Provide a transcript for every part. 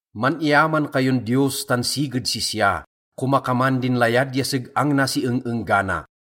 Man-iyaman kayon Diyos tan siged sisya, komakaman din layad ya seg-ang na si eng-enggana.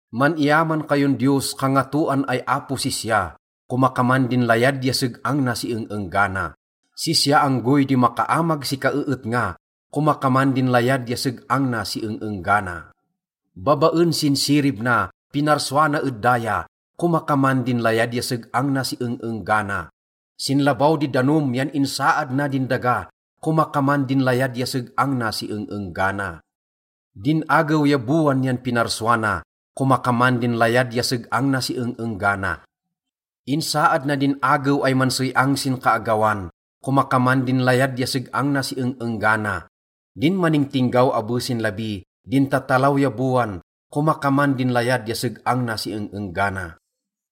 Man-iyaman kayon Diyos, kangatoan ay apo sisya, komakaman din layad ya seg-ang na si eng-enggana. Sisya anggoy di makaamag si kaeetnga, komakaman din layad ya seg-ang na si eng-enggana. Babaen sin sirib na, pinarsua na ed daya, komakaman din layad ya seg-ang na si eng-enggana. Sin labaw di danom yan insaad na din daga, komakaman din layad ya seg-ang na si eng-enggana. Din agew ya bowan yan pinarsua na, komakaman din layad ya seg-ang na si eng-enggana. Insaad na din agew ay mansey-ang sin kaagawan, komakaman din layad ya seg-ang na si eng-enggana. Din maningtinggaw abe sin labi, din tatalaw ya bowan, komakaman din layad ya seg-ang na si eng-enggana.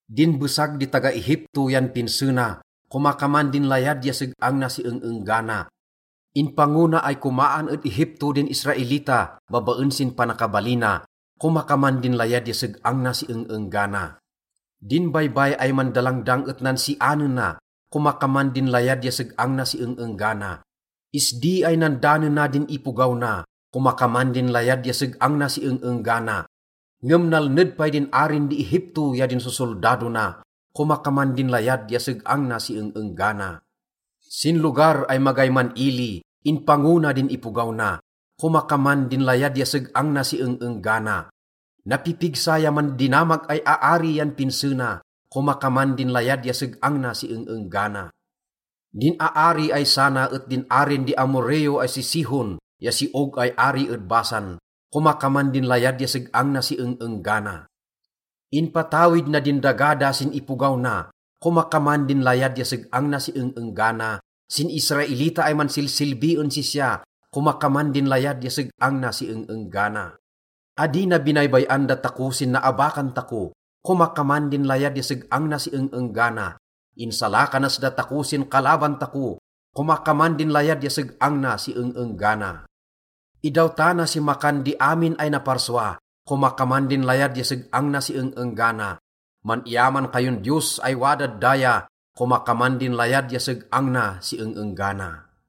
Din besag di taga-Egipto yan pinse na, komakaman din layad ya seg-ang na si eng-enggana. Inpango na ay komaan ed Egipto din Israelita babaen sin panakabalina, komakaman din layad ya seg-ang na si eng-enggana. Din Baybay ay Mandalangdang et nansianena, komakaman din layad ya seg-ang na si eng-enggana. Isdi ay nandanena din ipogaw na, komakaman din layad ya seg-ang na si eng-enggana. Ngem nalned pay din arin di Egipto ya din sosoldado na, komakaman din layad ya seg-ang na si eng-enggana. Sin lugar ay magay man-ili, inpango na din ipogaw na, komakaman din layad ya seg-ang na si eng-enggana. Napipigsa ya mandinamag ay aari yan pinse na, komakaman din layad ya seg-ang na si eng-enggana. Din aari ay sana et din arin di Amorreo ay si Sihon ya si Og ay ari ed Basan, komakaman din layad ya seg-ang na si eng-enggana. Inpatawid na din daga da sin ipogaw na, komakaman din layad ya seg-ang na si eng-enggana, sin Israelita ay mansilsilbi en sisya, komakaman din layad ya seg-ang na si eng-enggana. Adi na binaybay-an datako sin naabakan tako, komakaman din layad ya seg-ang na si eng-enggana. Insalakanas datako sin kalaban tako, komakaman din layad ya seg-ang na si eng-enggana. Idawtana si makan di amin ay naparsua, komakaman din layad ya seg-ang na si eng-enggana. Man-iyaman kayon Diyos ay wadad daya, komakaman din layad ya seg-ang na si eng-enggana.